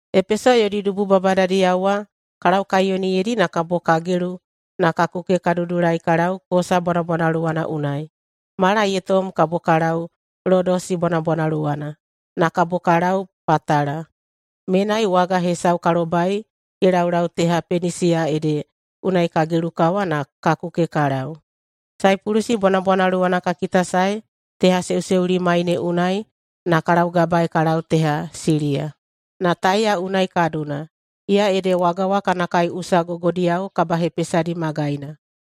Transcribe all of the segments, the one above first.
Epeso yodi dubu babadadiyao wa ka laukaiyoniyeidi na kabo ka gelu na ka kuke ka dudulai ka lau Kosa bwanabwanaluwana unai. Mala ye tom kabo ka lau Lodosi bwanabwanaluwana, na kabo ka lau Patala. Menai waga hesau ka lobai ye laulau teha Penisiya ede unai ka gelukawa na ka kuke ka lau. Saipulusi bwanabwanaluwana ka kitasaei tehaseuseulimai ne unai na ka laugabaei ka lau teha Siliya, na Taiya unai ka duna, iya ede waga wa kana kaiꞌusa gogodiyao kabahepesadi magaina.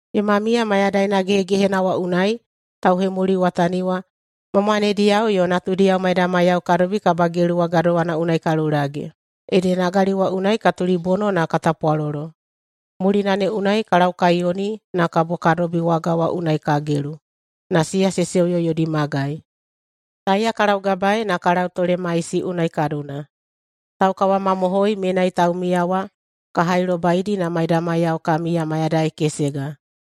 Yoma miya mayadaina gehegehena wa unai tauhemuliwatani wa ma mwanediyao yo natudiyao maidamaiyao ka dobi kabagelu wa gadowana unai ka lulage, ede nagali wa unai ka tulibono na ka tapwalolo. Mulina ne unai ka laukaiyoni na kabo ka dobi waga wa unai ka gelu, na siya se seuyo yodi magai. Taiya ka laugabaei na ka lau Tolemaisi unai ka duna. Taukawamamohoi menai taumiya wa ka hailobaidi na maidamaiyao ka miya mayadai kesega.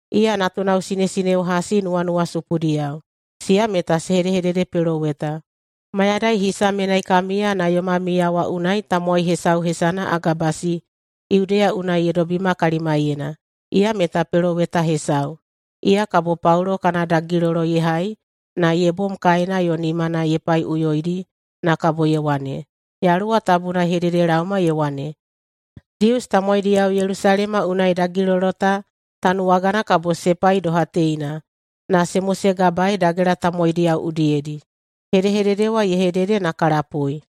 Iya natunao sinesineo hasi nuwanuwasupudiyao. Siya meta se hedehededepeloweta. Mayadai hisa menai ka miya na yoma miya wa unai tamowai hesau hesana Agabasi Yudeya unai ye dobima kalimaiyena, iya meta peloweta hesau. Iya kabo Paulo kana dagilolo ye hai na ye bom kaena yo nimana ye paiꞌuyoidi na kabo ye wane, “Yaluwa Tabuna ye hededelaoma ye wane, ‘Dius tamowaidiyao Yelusalema unai dagilolo ta tanuwagana kabo se pai doha teina na se mosegabaei dagela tamowaidiyao udiyedi.’” Hedehedede wa ye hedede na ka lapui,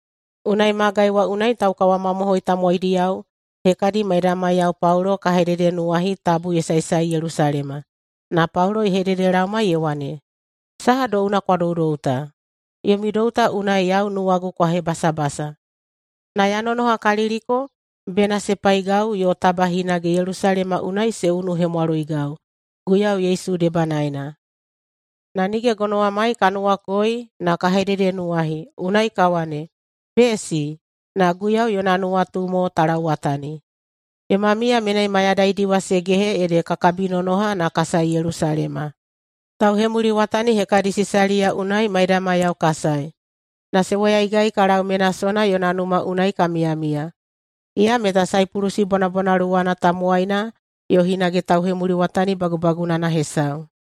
unai magai wa unai taukawamomohoi tamowaidiyao hekadi maidamaiyao Paulo ka hededenuwahi tabu ye saesae Yelusalema. Na Paulo ye hededelaoma ye wane, “Saha douna kwa doudou ta? Yomi dou ta unai yau nuwagu ta kwa hebasabasa, na ya nonohakaliliko bena se paigau yo taba hinage Yelusalema unai se unuhemwaloigau Guiyau Yesu debanaena.” Na nige gonowamai ka nuwakoi na ka hededenuwahi, unai ka wane, “Besi, na Guiyau yona nuwatu mo ta lauwatani.” Yoma miya menai mayadaidi wa se gehe ede ka kabinonoha na ka sae Yelusalema. Tauhemuliwatani hekadi Sisaliya unai maidamaiyao ka sae, na se woyaigai ka lau Menasona yona numa unai ka miyamiya. Iya meta Saipulusi bwanabwanaluwana tamowaina yo hinage tauhemuliwatani bagubagunana hesau.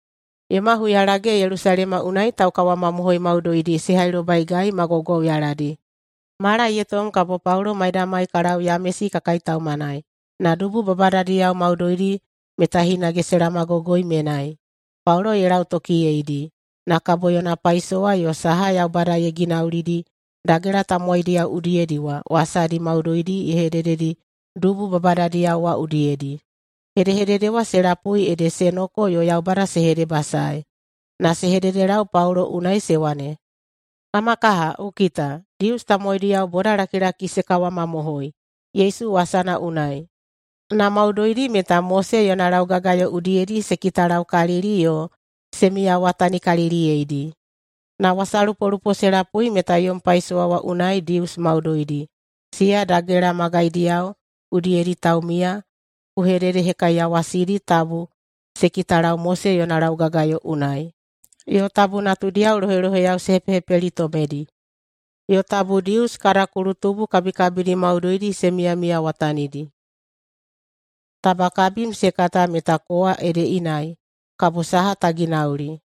Yoma huyalage Yelusalema unai taukawamamohoi maudoidi se hailobaigai ma gwaugwauyaladi. Mala ye tom kabo Paulo maidamai ka lau Yamesi ka kaitaumanai, na dubu babadadiyao maudoidi meta hinage se laomagogoi menai. Paulo ye lautokiyeidi, na kabo yona paisowa yo saha Yaubada ye ginaulidi dagela tamowaidiyao udiyedi wa wasadi maudoidi ye hedededi dubu babadadiyao wa udiyedi. Hedehedede wa se lapui ede se noko yo Yaubada se hedebasaei. Na se hededelau Paulo unai se wane, “Kama kaha! Ku kita, Dius tamowaidiyao bodalakilaki se kawamamohoi Yesu wasana unai, na maudoidi meta Mose yona laugagayo udiyedi se kitalaukalili yo se miyawatanikaliliyeidi. Na wasalupolupo se lapui meta yom paisowa wa unai Dius maudoidi, siya dagela magaidiyao udiyedi taumiya, ku hededehekaiyawasidi tabu se kitalau Mose yona laugagayo unai, yo tabu natudiyao loheloheyao se hepehepelitomedi, yo tabu Dius kada kulutubu kabikabidi maudoidi se miyamiyawatanidi. Taba kabim se kata meta kowa ede inai, kabo saha ta ginauli?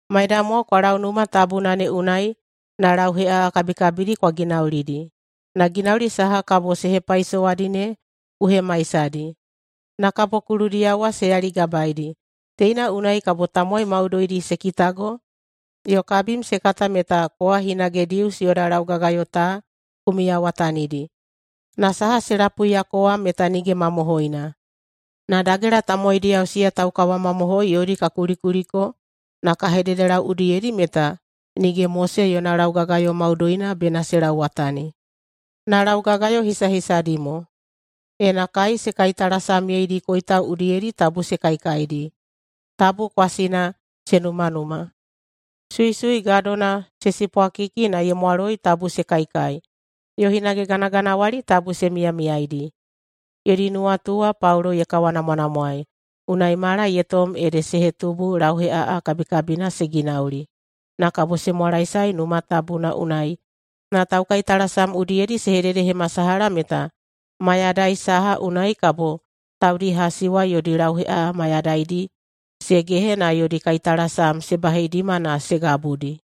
Maidamwao kwa lau Numa Tabuna ne unai na lauheꞌaꞌa kabikabidi kwa ginaulidi. Na ginauli saha kabo se hepaisowadi ne ku hemaisadi, na kabo kuludiyao wa se yaligabaedi. Teina unai kabo tamowai maudoidi se kitago yo kabim se kata meta kowa hinage Dius yoda laugagayo ta ku miyawatanidi na saha se lapuiyako wa meta nige mamohoina. Na dagela tamowaidiyao siya taukawamamohoi yodi ka kulikuliko na ka hededelau udiyedi meta nige Mose yona laugagayo maudoina bena se lauwatani, na laugagayo hisahisadi mo: Ena kai se kaitalasamyedi koitau udiyedi, tabu se kaikaidi, tabu kwasina se numanuma, suisui gadona se sipwakiki na ye mwaloi tabu se kaikai, yo hinage ganaganawali tabu se miyamiyaidi.” Yodi nuwatu wa Paulo ye kawanamwanamwaei, unai mala ye tom ede se hetubu lauheꞌaꞌa kabikabina se ginauli. Na kabo ye mwalaesae Numa Tabuna unai na taukaitalasam udiyedi ye hededehemasalaha meta mayadai saha unai kabo taudi hasi wa yodi lauheꞌaꞌa mayadaidi se gehe na yodi kaitalasam se baheidima na se gabudi.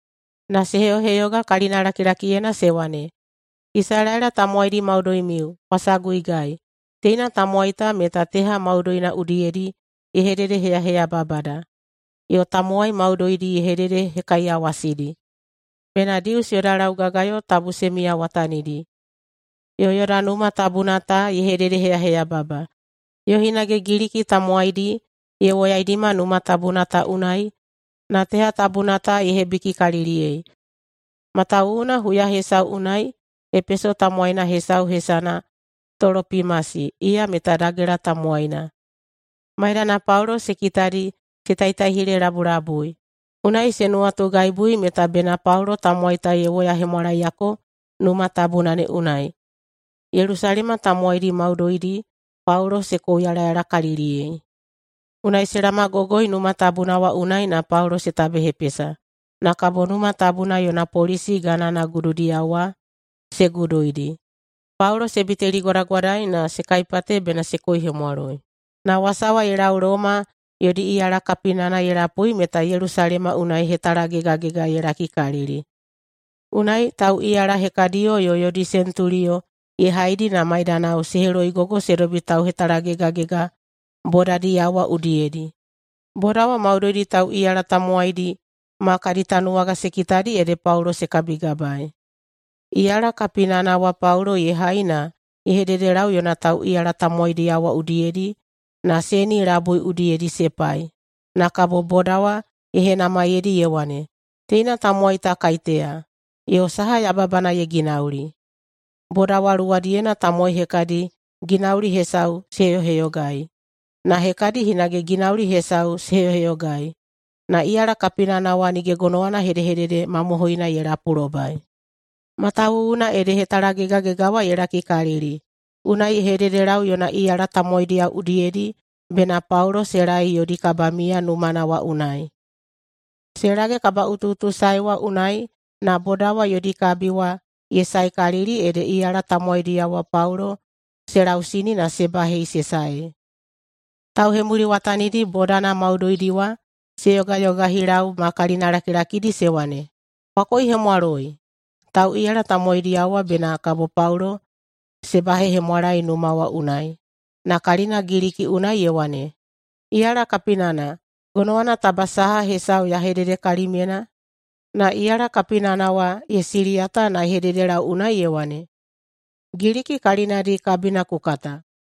Na se heyoheyoga kalina lakilakiyena se wane, “Isalaela tamowaidi maudoimiu, kwa saguigai! Teina tamowai ta meta teha maudoina udiyedi ye hededeheyaheyababada, yo tamowai maudoidi ye hededehekaiyawasidi bena Dius yoda laugagayo tabu se miyawatanidi, yo yoda Numa Tabuna ta ye hededeheyaheyababa. Yo hinage Giliki tamowaidi ye woyaidima Numa Tabuna ta unai na teha tabuna ta ye hebikikaliliyei!” Matawuwuna huya hesau unai Epeso tamowaina hesau hesana Tolopimasi, iya meta dagela tamowaina, maidana Paulo se kitadi se taitaihilelabulabui. Unai se nuwatugaibu meta bena Paulo tamowai ta ye woyahemwalaeyako Numa Tabuna ne unai. Yelusalema tamowaidi maudoidi Paulo se kouyalayalakaliliyei. Unai se laomagogoi Numa Tabuna wa unai na Paulo se tabehepesa, na kabo Numa Tabuna yona polisi gana gududiyao wa se guduidi. Paulo se biteligwadagwadai na se kaipate bena se koihemwaloi. Na wasa wa ye lau Loma yodi iyala kapinana ye lapui meta Yelusalema unai hetalagegagega ye lakikalili. Unai tauꞌiyala hekadiyo yo yodi sentuliyo ye haidi na maidanao se heloigogoi se dobi tauhetalagegagega bodadiyao wa udiyedi. Boda wa maudoidi tauꞌiyala tamowaidi ma kadi tanuwaga se kitadi ede Paulo se kabigabaei. Iyala kapinana wa Paulo ye hai na ye hededelau yona tauꞌiyala tamowaidiyao wa udiyedi na seni labui udiyedi se pai. Na kabo boda wa ye henamaiyeidi ye wane, “Teina tamowai ta kaiteya, yo saha yababana ye ginauli?” Boda wa luwadiyena tamowai hekadi ginauli hesau se heyoheyogaei, na hekadi hinage ginauli hesau se heyoheyogaei, na iyala kapinana wa nige gonowana hedehedede mamohoina ye lapulobai, matawuwuna ede hetalagegagega wa ye lakikalili. Unai ye hededelau yona iyala tamowaidiyao udiyedi bena Paulo se laei yodi kabamiya numana wa unai. Se lage kabaꞌutuꞌutusae wa unai na boda wa yodi kabi wa ye saekalili ede iyala tamowaidiyao wa Paulo se lausini na se bahei se saei. Tauhemuliwatanidi bodana maudoidi wa se yogayogahilau ma kalinalakilakidi se wane, “Kwa koihemwaloi!” Tauꞌiyala tamowaidiyao wa bena kabo Paulo se bahehemwalae numa wa unai, na kalina Giliki unai ye wane, “Iyala kapinana, gonowana taba saha hesau ya hedede kalimyena?” Na iyala kapinana wa ye siliyata na ye hededelau unai ye wane, “Giliki kalinadi kabina ku kata?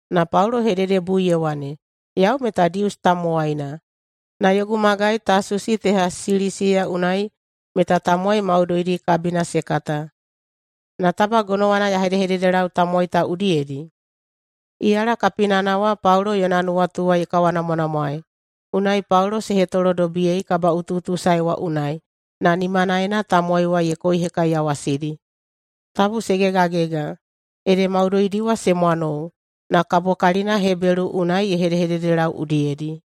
Na Paulo ye hededebui ye wane, “Yau meta Dius tamowaina, na yogu magai Tasusi teha Silisiya unai meta tamowai maudoidi kabina se kata. Na taba gonowana ya hedehededelau tamowai ta udiyedi?” Iyala kapinana wa Paulo yona nuwatu wa ye kawanamwanamwaei, unai Paulo se hetolodobiyei kabaꞌutuꞌutusae wa unai, na nimanaena tamowai wa ye koihekaiyawasidi, tabu se gegagega. Ede maudoidi wa se mwanou, na kabo kalina Hebelu unai ye hedehededelau udiyedi.